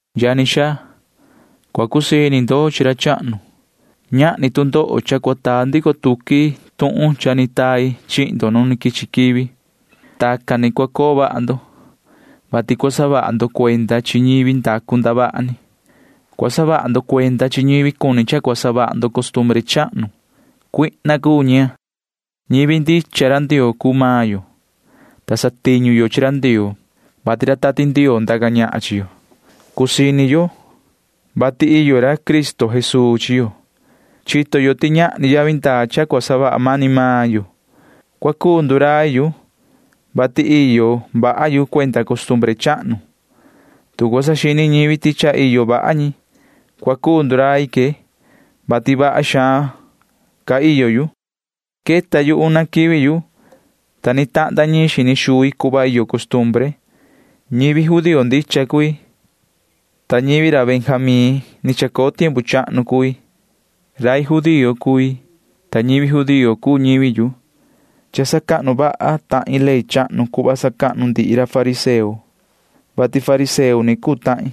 Yani xaa, cua cusii ini ndo chi ra chahnu. Ñahni tu ndoho cha cua taa ndico tuqui tuhun cha ni tai chihin ndo nu quichi quivi. Tacan ni cua coo vaha ndo, vati cua saha vaha ndo cuenda chi ñivi ndacu ndavaha ni. Cua saha vaha ndo cuenda chi ñivi cuni cha cua savaha ndo costumbre chahnu. Cuihna cuu ñi. Ñivi ndicha ra Ndioo cuu maan yo, ta satiñu yo chi ra Ndioo, vati ra Tati Ndioo ndaca ñahan chi yo. Cusii ini yo, vati iyo ra Cristo Jesuu chi yo. Chito yo ti ñahni yavi ndaa cha cua savaha mani maan yo. Cua cuu ndurai yu, vati iyo vaha yu cuenda costumbre chahnu. Tu cua saxini ñivi ti cha iyo vaha ñi, cua cuu ndurai que, vati vaha xaan ca iyo yu. Queta yu una quivi yu, ta ni tahnda ñiin xini xui cuhva iyo costumbre. Ñivi judío ndicha cui, ta ñivi ra Benjamín ni chacoo tiempu chahnu cui. Rai judío cui, ta ñivi judío cuu ñivi yu. Cha sacahnu vaha tahin ley chahnu cuhva sacahnu ndihi ra fariseo, vati fariseo ni cuu tahin.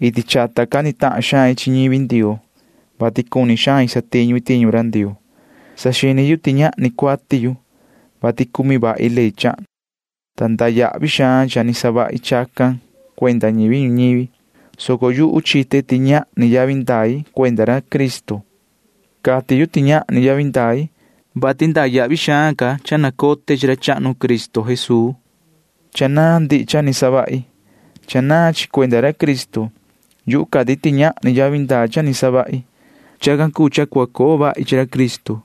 Iti chata cani tahan xain chi ñivi Ndioo, vati cuni xain satiñu i tiñu ra Ndioo. Saxini yu ti ñahni cuati yu, vati cumi vahi ley chahnu, ta iyo xaan yavi ndaa cha ni savahi chacan cuenda ñivi ñuñivi, soco yuhu chite ti ñahni yavi ndai cuenda ra Cristo. Cati yu ti ñahni yavi ndai, vati iyo xaan ca yavi ndaa cha nacote chi ra chahnu Cristo Jesuu. Cha naan ndihi cha ni savahi. Cha naan chi cuenda ra Cristo. Yuhu cati ti ñahni yavi ndaa cha ni savahi. Chacan cuu cha cua coo vahi chi ra Cristo.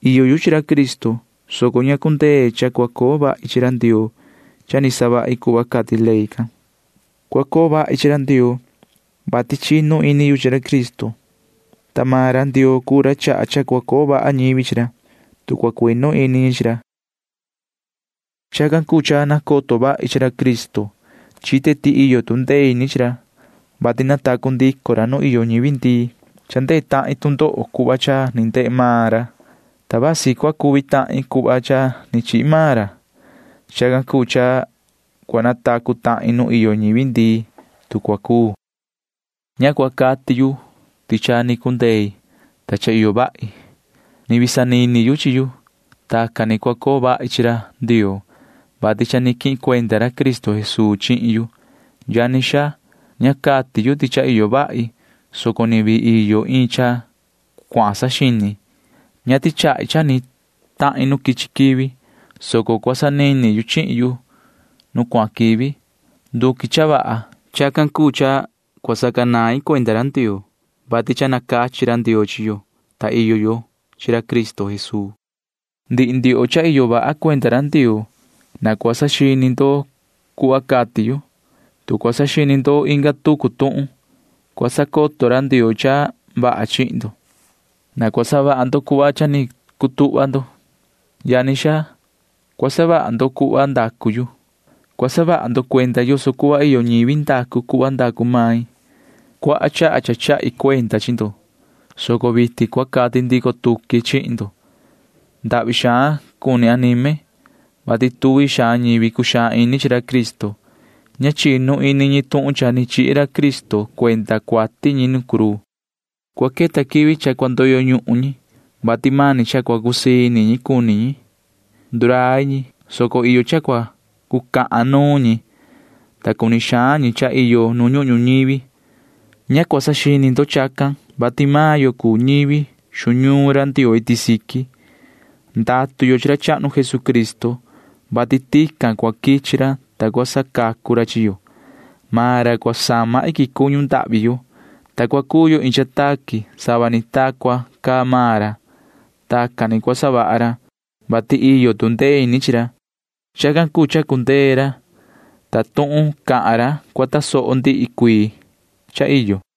Iyo yu chi ra Cristo, soco ña cundee cha cua coo vahi chi ra Ndioo cha ni savahi cuhva cati ley can. Cua coo vahi chi ra Ndioo, vati chinu ini yu chi ra Cristo, ta maan ra Ndioo cuu ra chaha cha cua coo vaha ñivi chi ra, tu cua cuinu ini ñi chi ra. Chacan cuu cha nacoto vahi chi ra Cristo. Chite ti iyo tu ndee ini chi ra, vati natacu ndico ra nu iyo ñivi ndii. Cha ndehe tahin tu ndoho cuhva cha ni ndehe maan ra, ta vasi cua cuvi tahin cuhva cha ni chihi maan ra. Chacan cuu cha cua natacu tahin nu iyo ñivi ndii, tu cua cuu. Ña cua cati yu ti cha ni cundei, ta cha iyo vahi. Ni vii sanini yu chi yu. Tacan ni cua coo vahi chi ra Ndioo, vati cha ni quihin cuenda ra Cristo Jesuu chihin yu. Yani xaa, ña cati yu ti cha iyo vahi, soco ni vii iyo iin cha cuahan saxini. Ña tichahi cha ni tahin nu quichi quivi, soco cua sanini yu chihin yu nu cuahan quivi. Nduqui cha vaha. Chacan cuu cha cua sacanain cuenda ra Ndioo, vati cha nacachi ra Ndioo chi yo, ta iyo yo chi ra Cristo Jesuu. Ndihi ndioho cha iyo vaha cuenda ra Ndioo―na cua saxini ndo cuhva cati yu. Tu cua saxini ndo inga tucu tuhun, cua sacoto ra Ndioo cha vaha chihin ndo. Na cua savaha ndo cuhva cha ni cundee cutuhva ndo. Yani xaa, cua savaha ndo cuhva ndacu yu. Cua saha vaha ndo cuenda yoso cuhva iyo ñivi ndacu cuhva ndacu main. Cuaha chaha cha chahi cuenda chi ndo, soco vitin cua cati ndico tuqui chihin ndo. Ndahvi xaan cuni anime, vati iyo xaan ñivi cuxaan ini chi ra Cristo. Ña chinu ini ñi tuhun cha ni chihi ra Cristo cuenda cuati ñi nu cruu. Cua queta quivi cha cua ndoyo ñuhun ñi, vati mani cha cua cusii ini ñi cuni ñi. Ndurai ñi, soco iyo cha cua cucahan nuun ñi, ta cuni xaan ñi cha iyo nu ñuhun ñuñivi. Ña cua saxini ndo chacan, vati maan yo cuu ñivi xu ñuun ra Ndioo iti siqui. Ndatu yo chi ra chahnu Jesucristo, vati tican cua quichi ra, ta cua sacacu ra chi yo. Maan ra cua sama iquin cuñu ndahvi yo, ta cua cuu yo iin cha taqui sava ni ta cua caa maan ra. Tacan ni cua savaha ra, vati iyo tu ndee ini chi ra. Chacan cuu cha cundee ra, ta tuhun cahan ra cua tasoho ndihi cuii cha iyo.